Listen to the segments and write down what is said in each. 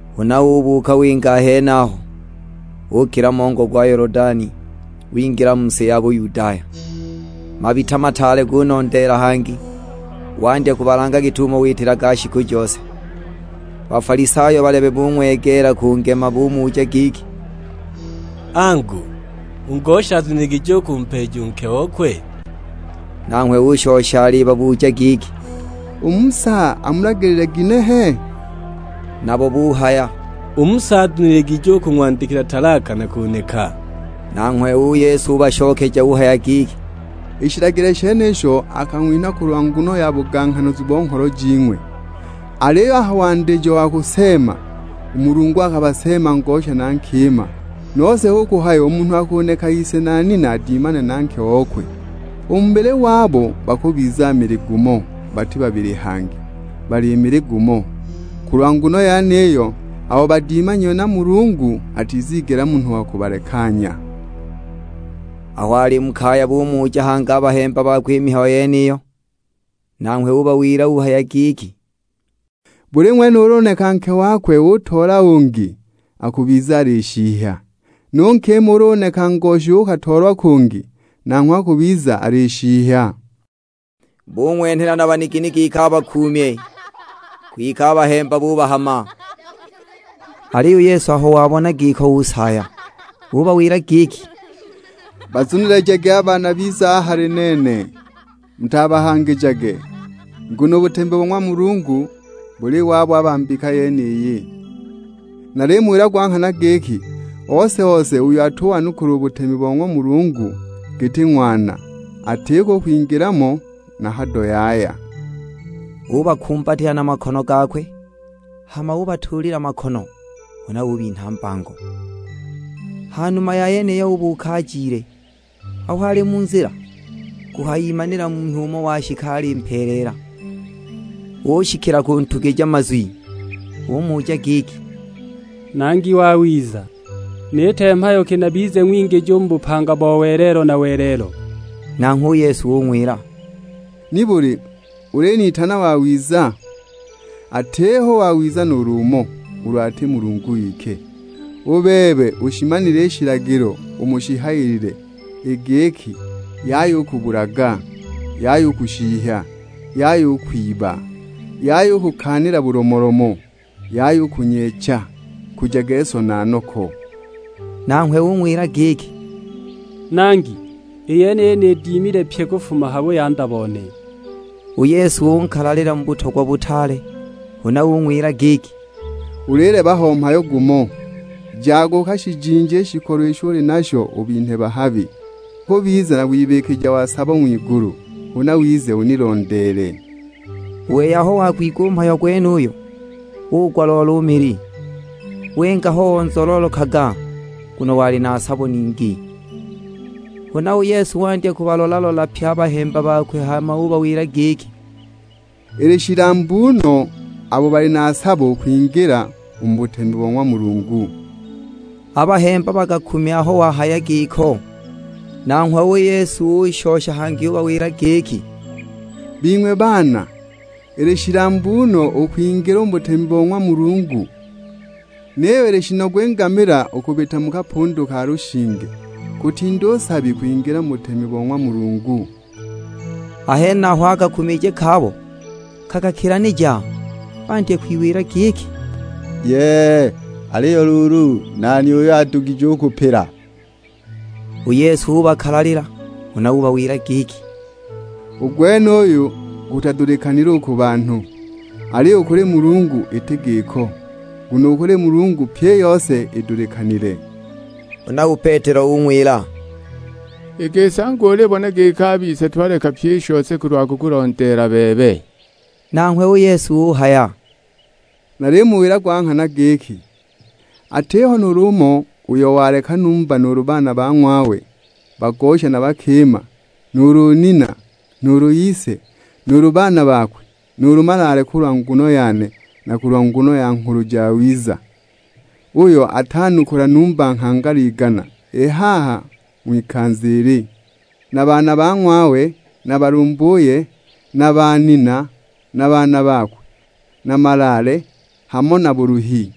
Huna ubuuka winga a henaho, ukila mongo gwa Yolodani, wingila mu si ya Buyudaya. Mabita mataale gunondeela hangi, wandya kubalanga git'umo witilaga shiku jose. Bafalisayo balebe bung'wegeela kungema, bumuja giki; "Angu, u ngosha azuniligije u kumpeeja u nke okwe?" Nanghwe ushosha alibabuja giki, "U Musa amulagilile ginehe?" Nabo buhaya, "U Musa azuniligije kung'wandikila talaka na kuneka." Nanghwe u Yesu ubashokeja uhaya giki, "I shilagilo shenisho akang'winha kulwa nguno ya buganghanazu bo ngholo jing'we. Aliyo a ha wandijo wa kuseema, u Mulungu akabaseema ngosha na nkima. Nose hu kuhaya u munhu akuneka ise na nina adimane na nke okwe. U mu bubili wabo bakubiza mili gumo, bati babili hangi, bali mili gumo. Kulwa nguno yeniyo, abo badimanyiwe na Mulungu, atizigela munhu wa kubalekanya." Aho ali mu kaya, bumuja hangi a bahemba bakwe i mihayo yeniyo. Nanghwe ubawila uhaya giki, "Buli ng'wene ulu uneka nke wakwe utoola ungi akubiza alishihya. Nu nkima ulu uneka ngoshi uukatoolwa kungi, nanghwe akubiza alishihya." Bung'wenhela na banigini giki abakuumye, kwike a bahemba bubahama. Aliyo u Yesu aho wabona giko usaaya. Ubawila giki, "Bazunilijagi a baana bize a hali nene, mutabahangijage. Nguno u butemi bo ng'wa Mulungu buli wabo a ba mbika yeniyi. Nalimuwila gwa nghana giki, ose-ose uyo atuwanukula u butemi bo ng'wa Mulungu giti ng'wana, atiko u kwingila mo na hado yaya." Ubakumbatila na makono gakwe, hama ubatuulila makono, huna ubinha mbango. Ha numa ya yeniyo ubuuka ajile. Aho ali mu nzila, kuhayimanila munhu umo washika alimpeeleela, ushikila kuntugija mazwi. Umuja giki, "Nangi wawiza, niite mhayo ki nabize ng'wingiji u mu bupanga bo welelo na welelo?" Nanghwe u Yesu ung'wila, "Nibuli ulinitana wawiza? Atiho wawiza nuulu umo, ulu ati Mulungu wike! U bebe ushimanile i shilagilo umo shihayilile; i giki, 'Yaya u kubulaga, Yaya u kushihya, Yaya u kwiba, Yaya u kukaanila bulomolomo, Yaya u kunyeecha, Nkujage so na noko.' " Nanghwe ung'wila giki, "Nangi i yeniyi nidimile pyi kufuma ha buyanda bone." U Yesu unkalalila mu butogwa butaale, huna ung'wila giki, "Ulileba ho mhayo gumo, jaga ukashijinje i shikolo isho uli nasho ubinhe bahabi, ukubiza na wibikija wa sabo ng'wigulu, huna wize unilondeele." U wei aho wagwigwa u mhayo gwenuyo, ugwa-loolo u mili, winga ho onzololokaga, nguno wali na sabo ningi. Huna u Yesu wandya kubalola-lola pye a bahemba bakwe, hama ubawila giki, "Ili shilambu no abo bali na sabo u kwingila u mu butemi bo ng'wa Mulungu!" A bahemba bakakumya aho wahaya giko. Nanghwe u Yesu ushosha hangi ubawila giki, "Bing'we baana, ili shilambu no u kwingila u mu butemi bo ng'wa Mulungu. Niyo ili shinogu i ngamila u kubita mu kapundu ka lushinge, kutinda u nsabi kwingila mu butemi bo ng'wa Mulungu!" A henaho a kakumije kabo kakakilanija. Bandya kwiwila giki, "Yee! Aliyo luulu, nani uyo adugije u kupila?" U Yesu ubakalalila, huna ubawila giki, "U gwenuyu gutadulikanile u ku banhu, aliyo u kuli Mulungu iti giko, nguno u kuli Mulungu pyi i yose idulikanile." Huna u Petelo ung'wila, "I gisi angu ulibona giki a bise twaleka pyi i shose kulwa kukulondeela bebe!" Nanghwe u Yesu uhaya, "Nalimuwila gwa nghana giki, atiho nuulu umo uyo waleka numba nuulu baana ba ng'wawe bagosha na bakima, nuulu nina, nuulu ise, nuulu baana bakwe, nuulu malaale kulwa nguno yane na kulwa nguno ya Nghulu Jawiza, uyo atanukula numba nghangala igana i haha u ng'wikanza ili, na baana ba ng'wawe na balumbuye, na banina, na baana bakwe, na malaale, hamo na buluhi;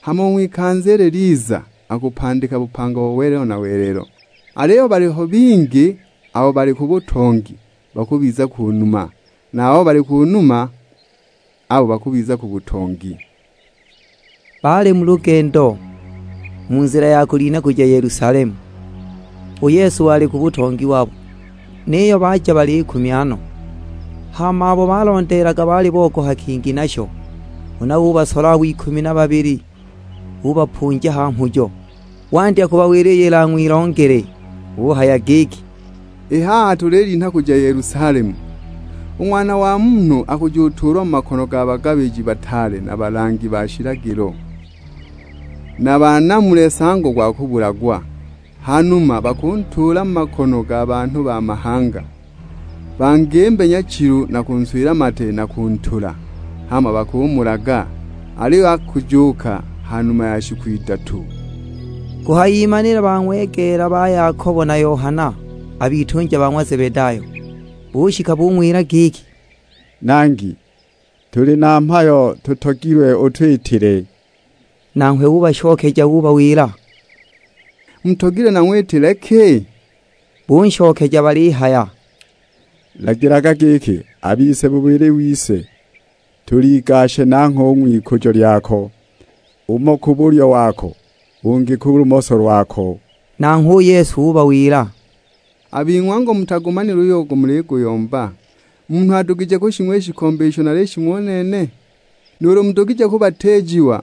hama u ng'wikanza ilo liliza akupandika bupanga bo welelo na welelo. Aliyo baliho bingi abo bali ku butongi, bakubiza ku numa; na a babo bali ku numa, abo bakubiza ku butongi." Baali mu lugendo, mu nzila ya kulinha kuja Yelusalemu, u Yesu wali ku butongi wabo. Niyo baja balikumya no, hama abo balondeelaga baali bogoha kingi nasho! Huna ubasola abo ikumi na babili ubapunja ha mhujo, wandya kubawila iyo ilang'wilongele. Uhaya giki, "I haha tulilinha kuja Yelusalemu, u Ng'wana wa Munhu akujutuulwa mu makono ga bagabiji bataale na balangi ba shilagilo, banamule nsango gwa kubulagwa. Ha numa bakuntuula mu makono ga banhu ba mahanga, bangimbe nyachilu na kunswila mate na kuntula, hama bakumulaga. Aliyo akujuuka ha numa ya shiku idatu." Kuhayimanila bang'wegeela ba Yakobo na Yohana, a bitunja ba ng'wa Zebedayo, bushika bung'wila giki, "Nangi, tuli na mhayo tutogilwe utwitile." Nanghwe ubashokeja ubawila, "Mutogilwe nang'witile ki?" Bunshokeja balihaya, "Lagilaga giki, a bise bubili wise tuligashe nangho u ng'wikujo lyako; umo ku bulyo wako, ungi ku lumoso lwako!" Nanghwe u Yesu ubawila, "A bing'we angu mutagumanile uyo muligulomba! Mudugije kushing'wa i shikombe isho nalishing'wa u nene? Nuulu mudugije kubatiijiwa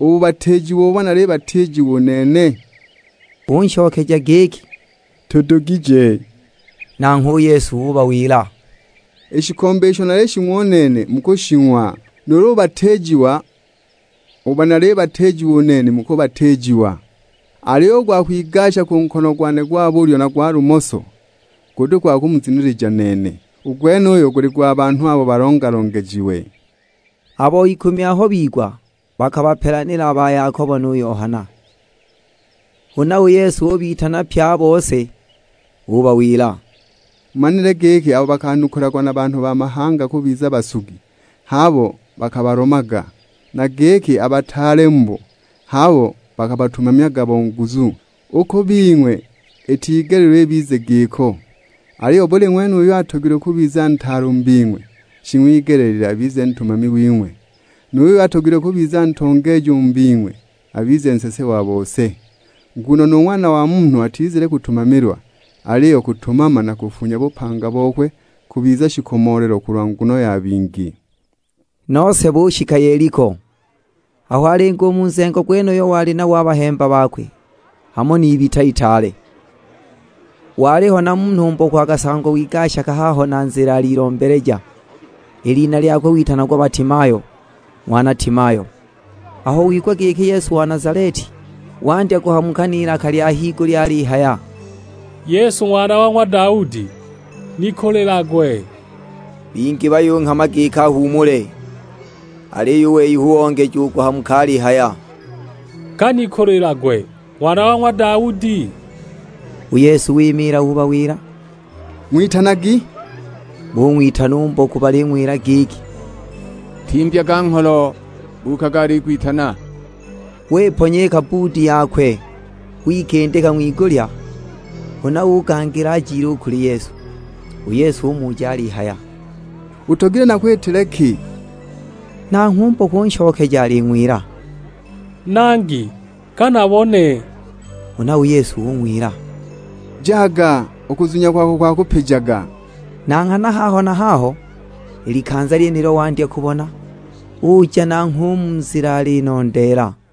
u bubatiijiwa ubo nalibatiijiwa u nene?" Bunshokeja giki, "Tudugije!" Nanghwe u Yesu ubawila, "I shikombe isho nalishing'wa u nene mukushing'wa, nu bubatiijiwa ubo nalibatiijiwa u nene mukubatiijiwa. Aliyo u gwa kwigasha ku nkono gwane gwa bulyo na gwa lumoso, guti gwa kumuzunilija nene, u gwenuyo guli gwa banhu abo balonja-longejiwe!" Abo ikumi aho bigwa bakabapelanila a ba Yakobo nu Yohana. Huna u Yesu ubitana pye a bose; ubawila, "Mumanile giki abo bakanukulagwa na banhu ba mahanga kubiza basugi h'abo bakabalomaga, na giki a bataale mubo h'abo bakabatumamyaga bo nguzu! U ku bing'we itigeleelilwe ibize giko, aliyo buli ng'wene uyo atogilwe kubiza ntaale u mu bing'we, shing'wigeleelilwe abize ntumami wing'we. Nu yuyo atogilwe kubiza ntongeeji u mu bing'we abize nsese wa bose. Nguno nu Ng'wana wa Munhu atizile kutumamilwa, aliyo kutumama na kufunya bupanga bokwe kubiza shikomoolelo kulwa nguno ya bingi." Nose bushika Yeliko, aho alinga u mu nzengo gwenuyo wali nabo na a bahemba bakwe, hamo n'ibita itaale. Waliho na munhu mboku akasangwa wigashaga haho na nzila alilombeleja; i lina lyakwe witanagwa Batimayo, ng'wana Timayo. Aho wigwa giki Yesu wa Nazaleti, wandya kuhamuka n'ilaka lya higulya alihaya, "Yesu Ng'wana wa ng'wa Daudi, nikulilagwe!" Bingi buyunghama giki ahuumule, aliyo u wei hu ongeja u kuhamuka alihaya, "Ka nikulilagwe Ng'wana wa ng'wa Daudi!" U Yesu wimiila ubawila, "Ng'witanagi." Bung'witana u mboku baling'wila giki, "Timbyaga ngholo, buukaga alikwitana." Wiponya i kabbuudi yakwe, wikindika ng'wigulya, huna ugangila ajile u kuli Yesu. U Yesu umuja alihaya, "Utogilwe nakwitile ki?" Nanghwe u mboku unshokeja aling'wila, "Nangi, ka nabone!" Huna u Yesu ung'wila, "Jaga, u kuzunya kwako kwakupijaga." Na nghana haho na haho, i likanza lyenilo wandya kubona, uja nanghwe u mu nzila alinondeela.